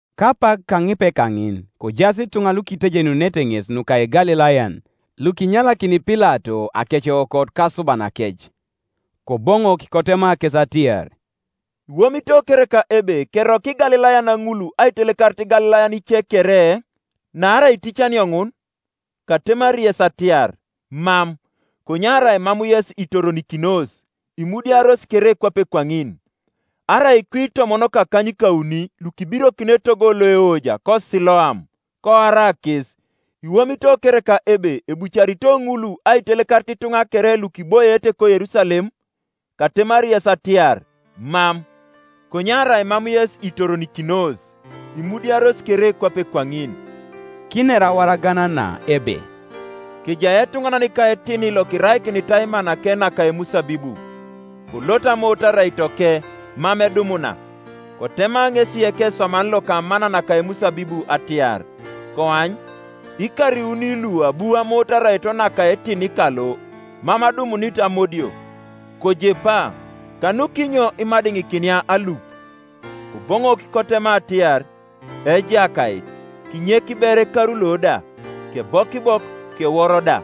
Kapak kaŋipe kaŋin kojaas ituŋa lukitejenunete ŋes nuka Igalilayan, lukinyalakini Pilato akeceokot kasubanakec. Koboŋok kotema kes atiar, “Iwomito kereka ebe keroko Igalilayan ŋul aitelekarit Igalilayan ice kere, naarai iticanio ŋun? Katemari yes atiar, Mam; konye arai mam yes itoronikinos, imudiaros kere kwape kwaŋin, Arai kwi itomon kakanykauni lukibirokin etogo loeoja, koSiloam, koara kes, iwomito kereka ebe ebucarito ŋul aitelekarit ituŋa kere lukiboiete koYerusalem? Katemari yes atiar, Mam; konye arai mam yes itoronikinos, imudiaros kere kwape kwaŋin.” Kiner awaragan na ebe, “Kejai etuŋanan ka etini lokiraikinitai manake naka emusabibu; kolot amoot araitoke, mam edumuna. Kotema ŋesi ekeswaman loka amana naka emusabibu atiar, ‘Koany, ikar iuni lu abu amoot araito naka etini kalo, mam adumunit amodio. Kojepa; kanukinyo imadiŋikinia alup?’ Koboŋok kotema atiar, ‘Ejakait, kinyek ber ekaru lo da, kebokibok kewor da.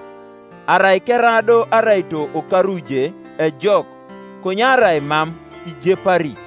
Arai kera do araito okaru je, ejok; konye arai mam, ijepari.’”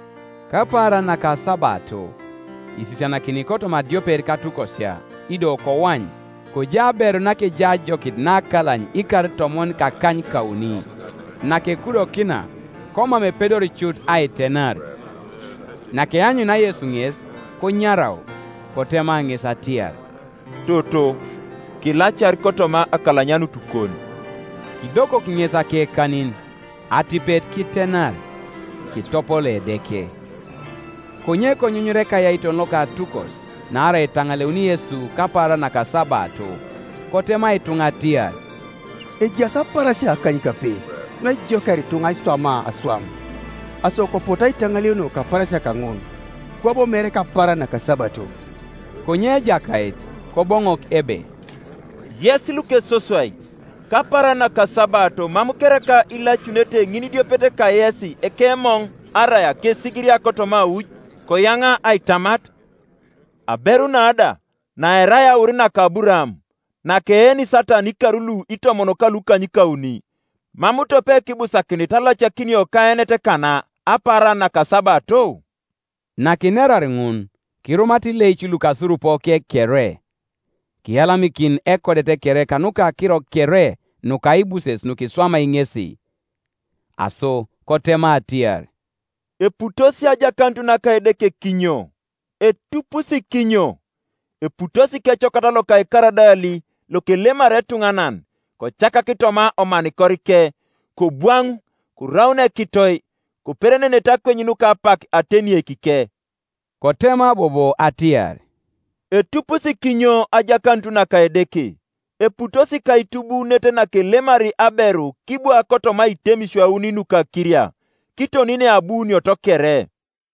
Kapaaran nakasabato isisianakini kotoma adiopet katukosia. Ido koany, kojai aberu nakejai ajokit nakalany ikar itomon kakanykauni; nakekudokina, komam epedori cut aitenar, Nakeanyunia Yesu ŋes, konyarau, kotema ŋes atiar, “Toto, kilacar kotoma akalanyanutukon.” Kidokok ŋes akekanin, atipet kitenar, kitopolo Edeke. Konye konyunyura ekayaiton loka atukos naarai etaŋaleun Yesu kapaaran nakasabato, kotema ituŋa atiar, “Ejaas apaarasia akanykape nuejokiar ituŋa aiswamaa aswam; aso kopotu aitaŋaleunio kapaarasia kaŋun, kwabo mere kapaaran nakasabato.” Konye Ejakait Koboŋok ebe, “Yes lukesoswai! Kapaaran nakasabato mam kereka ilacununete ŋinidiopet kayes ekemoŋ arai akesigiria kotoma auj, koyaŋa aitamat? Aberu na da, naerai aur naka Aburaam, nakeeni Satan ikar lu itomon kalukanykauni, mam tope kibusakinit alacakinio kaenet kana apaaran nakasabato?” Nakinerar ŋun, kirumata ileic lukasurupoke kere: kiyalamikin ekodet kere kanuka akiro kere nukaibuses nukiswamai ŋesi. Aso kotema atiar, “Eputos ajakanut naka Edeke kinyo? Etupusi kinyo? Eputosi kecokat loka ekaradali lokelemari etuŋanan, kocakak toma omanikorike; kobwaŋ, koraun ekitoi; koperenenete akweny nuka apak atenieikike.” Kotema bobo atiar, “Etupusi kinyo ajakanut naka Edeke? Eputosi kaitubuunet nakelemari aberu kibwa kotoma aitemisio auni nuka akiria, kiton neabuunioto kere.”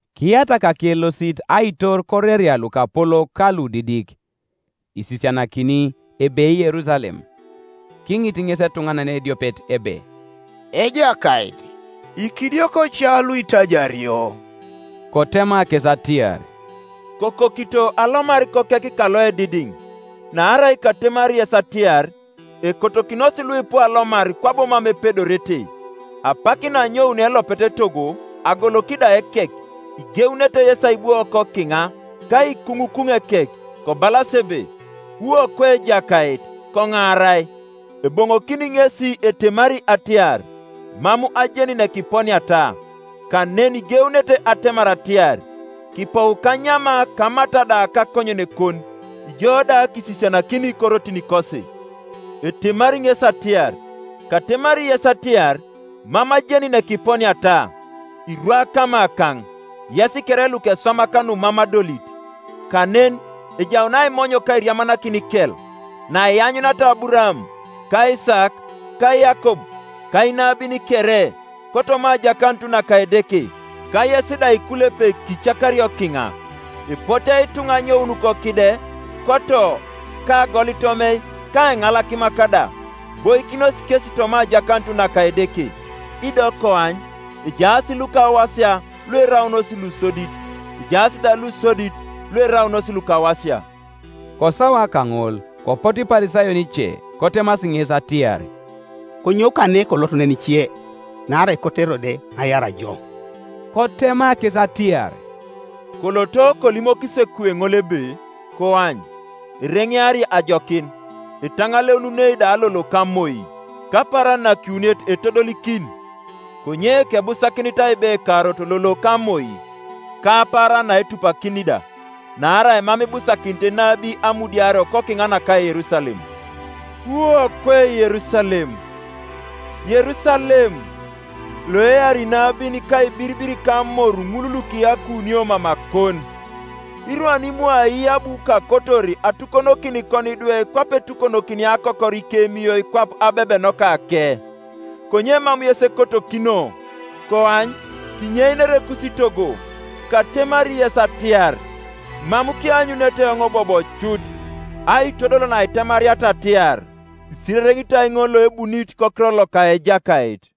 Kiyatak akelosit aitor koreria lukapolok ka ludidik, isisianakini, ebei Yerusalem, Kiŋit ŋes etuŋanan ediopet ebe, “Ejakait, ikidioko ca luitaiario?” Kotema kes atiar, “Kokokito alomar kokek kaloedidiŋ: naarai katemari yes atiar, Ekotokinos luipu alomar kwabo mam epedorete. Apak naanyounio elopet etogo agoloki da ekek, igeunete yesi aibwo kokiŋa, ka aikuŋukuŋ ekek, kobalas ebe, ‘Wu okwe Ejakait, koŋaarai;’ eboŋokini ŋesi etemari atiar, ‘Mam ajeni nekiponiata.’ Kanen igeunete atemar atiar, ‘Kipou kanyama kamata da kakonyenekon, ijo da kisisianakini korotinikosi;’ etemari ŋesi atiar, ‘Katemari yes atiar, Mam ajeni nekiponiata; irwa kamakaŋ, yes kere lukeswamak numam adolit.’ Kanen ejaun aimony ka airiamanakin ikel, naianyuniata Aburaam, ka Isaak, ka Yakob, ka inabin kere, kotoma ajakanut naka Edeke, ka yes da ikulepek kicakario kiŋa. Epote ituŋa anyoun kokide, koto, ka agolitomei ka eŋalakimak da, iboikinos kesi toma ajakanut naka Edeke. Ido koany, ejaas lukawasia lueraunos lusodit, ejaas da lusodit, lueraunos lukawasia.” Kosawa kaŋol kopotu Iparisayon ice kotemasi ŋes atiar, “Konyou kane kolot nenice; naarai ekoto Kerode aiar jo.” Kotema kes atiar, “Koloto kolimokis ekuwe ŋol ebe, ‘Koany, ereŋeari ajokin, etaŋaleununei da lolo ka moi, kapaaran nakiwuniet etodolikin. Konye kebusakinit aibe ekarot lolo ka moi, ka apaaran naetupakini da; naarai mam ibusakinit enabi amudiario kokiŋa naka Yerusalem.’ Wu okwe Yerusalem, Yerusalem, loeari inabin ka aibiribir kamor ŋul lukiyakunio mamakon! Irwan imwa ai abu kakotor atukonokin ikonidwe kwape etukonokinia akokor ikemiyoi kwap abebenokake, konye mam yes ekotokino! Koany, kinyeinere ekusitogo. Katemari yes atiar, Mam kianyunete eoŋ bobo cut, aitodol naitemariata atiar, ‘Isirereŋitoi ŋol loebunit kokiror loka Ejakait!’”